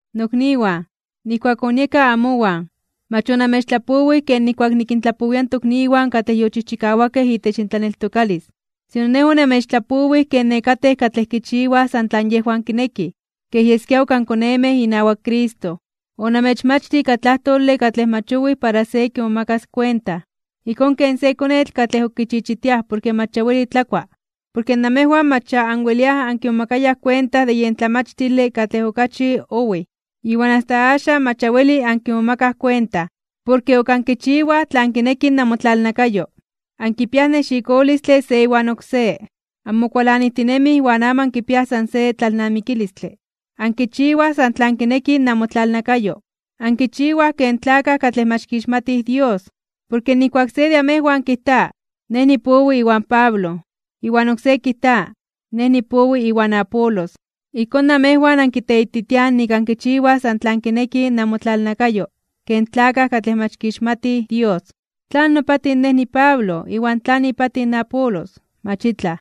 Nokniwan, nijkuak onieka amowan, mach onamechtlapowij ken nijkuak nikintlapowia in tokniwan katlej yochijchikawakej itech intlaneltokalis. Sino nej onamechtlapowij ken nekatej katlej kichiwaj san tlan yejwan kinekij, kej yeskia ok ankonemej inawak Cristo. Onamechmachtij ika tlajtole katlej mach owij para se kimomakas kuenta, ijkón ken se konetl katlej ok kichichitiaj porke mach ya weli tlakua, porke namejwan mach ya anweliaj ankimomakayaj kuenta de yen tlamachtile katlej okachi owij, iwan asta axan mach ya weli ankimomakaj kuenta. Porke ok ankichiwaj tlan kineki namotlalnakayo. Ankipiaj nexikolistle se iwan oksé, anmokualanijtinemij iwan amo ankipiaj san se tlalnamikilistle. Ankichiwaj san tlan kineki namotlalnakayo. Ankichiwaj ken tlakaj katlej mach kixmatij Dios. Porke nijkuak se de amejwan kijta: “Nej nipowi iwan Pablo”, iwan oksé kijta: “Nej nipowi iwan Apolos”, ijkón namejwan ankiteititiaj nik ankichiwaj san tlan kineki namotlalnakayo ken tlakaj katlej mach kixmatij Dios. ¿Tlan nopatij nej niPablo iwan tlan ipatij in Apolos? Mach itlaj.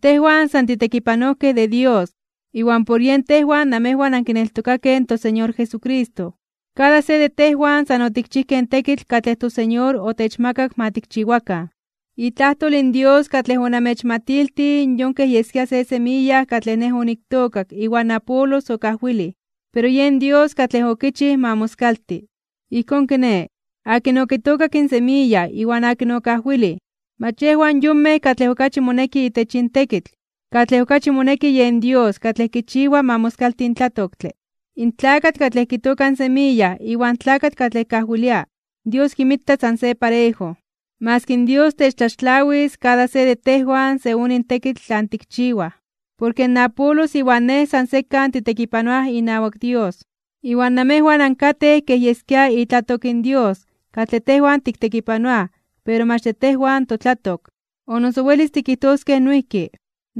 Tejwan san titekipanojkej de Dios, iwan por yen tejwan namejwan ankineltokakej in toSeñor Jesucristo. Kada se de tejwan san otikchijkej in tekitl katlej in toSeñor otechmakak ma tikchiwakan. Itlajtol in Dios katlej onamechmatiltij yon kej yeskia se semiya katlej nej oniktookak iwan Apolos okajwilij. Pero yen Dios katlej okichij ma moskalti. Ijkón kiné, akin okitookak in semiya iwan akin okajwilij, mach yejwan yonmej katlej okachi moneki itech yin tekitl, katlej okachi moneki yen Dios katlej kichiwa ma moskalti in tlatoktle. In tlakatl katlej kitooka in semiya iwan tlakatl katlej kajwilia, Dios kinmita san se parejo. Maski Dios techtlaxtlawis kada se de tejwan según in tekitl tlan tikchiwaj. Porke in Apolos iwan nej san sekan titekipanoaj inawak Dios. Iwan amejwan ankatej kej yeskia itlatok in Dios katlej tejwan tiktekipanoaj pero mach de tejwan totlatok. O noso welis tikijtoskej noijki,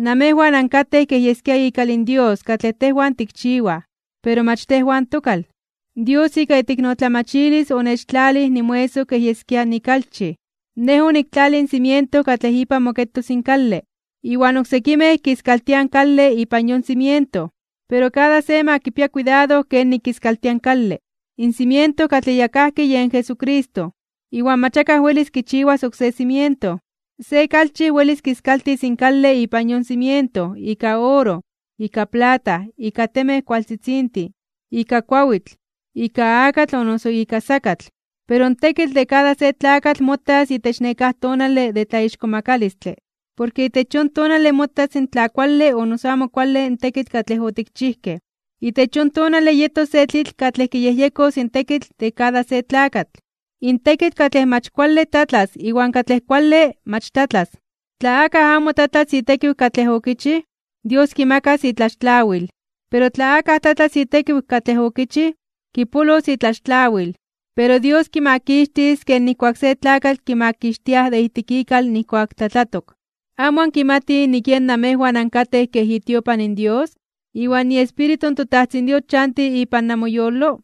amejwan ankatej kej yeskia ikal in Dios katlej tejwan tikchiwaj, pero mach tejwan tokal. Dios ika iteiknotlamachilis onechtlalij nimoesoj kej yeskia nikalchij. Nej oniktlalij in cimiento katlej ipan moketos in kale, iwan oksekimej kiskaltiaj in kale ipan yon cimiento. Pero kada se ma kipia kuidado kenik kiskaltia in kale. In cimiento katlej ya kajki yen Jesucristo, iwan mach akaj welis kichiwas oksé cimiento. Se kalchij welis kiskaltis in kale ipan yon cimiento ika oro, ika plata, ika temej kualtzitzintin, ika kuawitl, ika akatl o noso ika sakatl. Pero in tekitl de kada se tlakatl motas itech nekáj tonale de tlaixkomakalistle (tlatzonmanalos). Porke itech yon tonale motas tla kuale o noso amo kuale in tekitl katlej otikchijkej. Itech yon tonale yetos se tlitl katlej kiyejyekos in tekitl de kada se tlakatl, in tekitl katlej mach kuale tlatlas iwan katlej kuale mach tlatlas. Tla akaj amo tlatlas itekiw katlej okichij, Dios kimakas itlaxtlawil. Pero tla akaj tlatlas itekiw katlej okichij, kipolos itlaxtlawil, pero Dios kimakixtis ken nijkuak se tlakatl kimakixtiaj de ijtik ikal nijkuak tlatlatok. ¿Amo ankimatij nik yen namejwan ankatej kej itiopan in Dios, iwan nik iEspíritu in toTajtzin Dios chanti ipan namoyolo?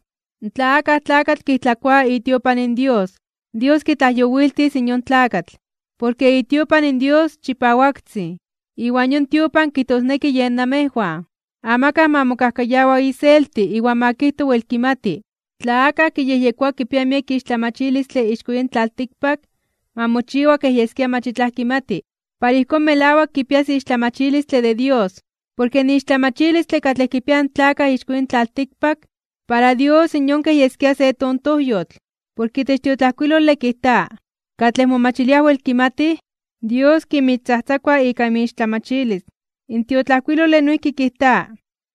Tla akaj tlakatl kijtlakoa itiopan in Dios, Dios kitlajyowiltis in yon tlakatl. Porke itiopan in Dios chipawaktzin, iwan yon tiopan kijtosneki yen namejwan. Amakaj ma mokajkayawa iselti iwan ma kijto wel kimati. Tla akaj kiyejyekoa kipia miek ixtlamachilistle ixko yin tlaltikpak, ma mochiwa kej yeskia mach itlaj kimati, para ijkón melawak kipias ixtlamachilistle de Dios. Porke in ixtlamachilistle katlej kipiaj in tlakaj ixko yin tlaltikpak, para Dios yon kej yeskia se tontojyotl. Porke itech tiotlajkuilole kijta: “Katlej momachiliaj wel kimatij, Dios kinmixtzajtzakua ika inmixtlamachilis.” In tiotlajkuilole noijki kijta: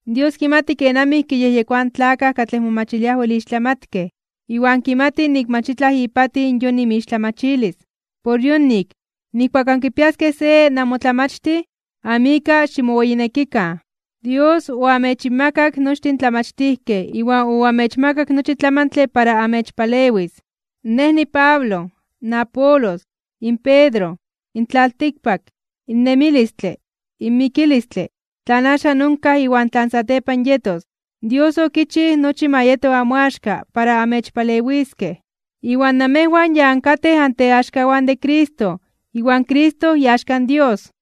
“Dios kimati kenamij kiyejyekoaj in tlakaj katlej momachiliaj wel ixtlamatkej, iwan kimati nik mach itlaj ipatij yon inmixtlamachilis.” Por yonik, nijkuak ankipiaskej se namotlamachtij, amo ika ximoweyinekikan. Dios oamechinmakak nochtin in tlamachtijkej iwan oamechmakak nochi tlamantle para amechpalewis. Nej niPablo, in Apolos, in Pedro, in tlaltikpak, in nemilistle, in mikilistle, tlan axan onkaj iwan tlan satepan yetos, Dios okichij nochi ma yeto amoaxka para amechpalewiskej. Iwan namejwan ya ankatej anteaxkawan de Cristo, iwan Cristo iaxka in Dios.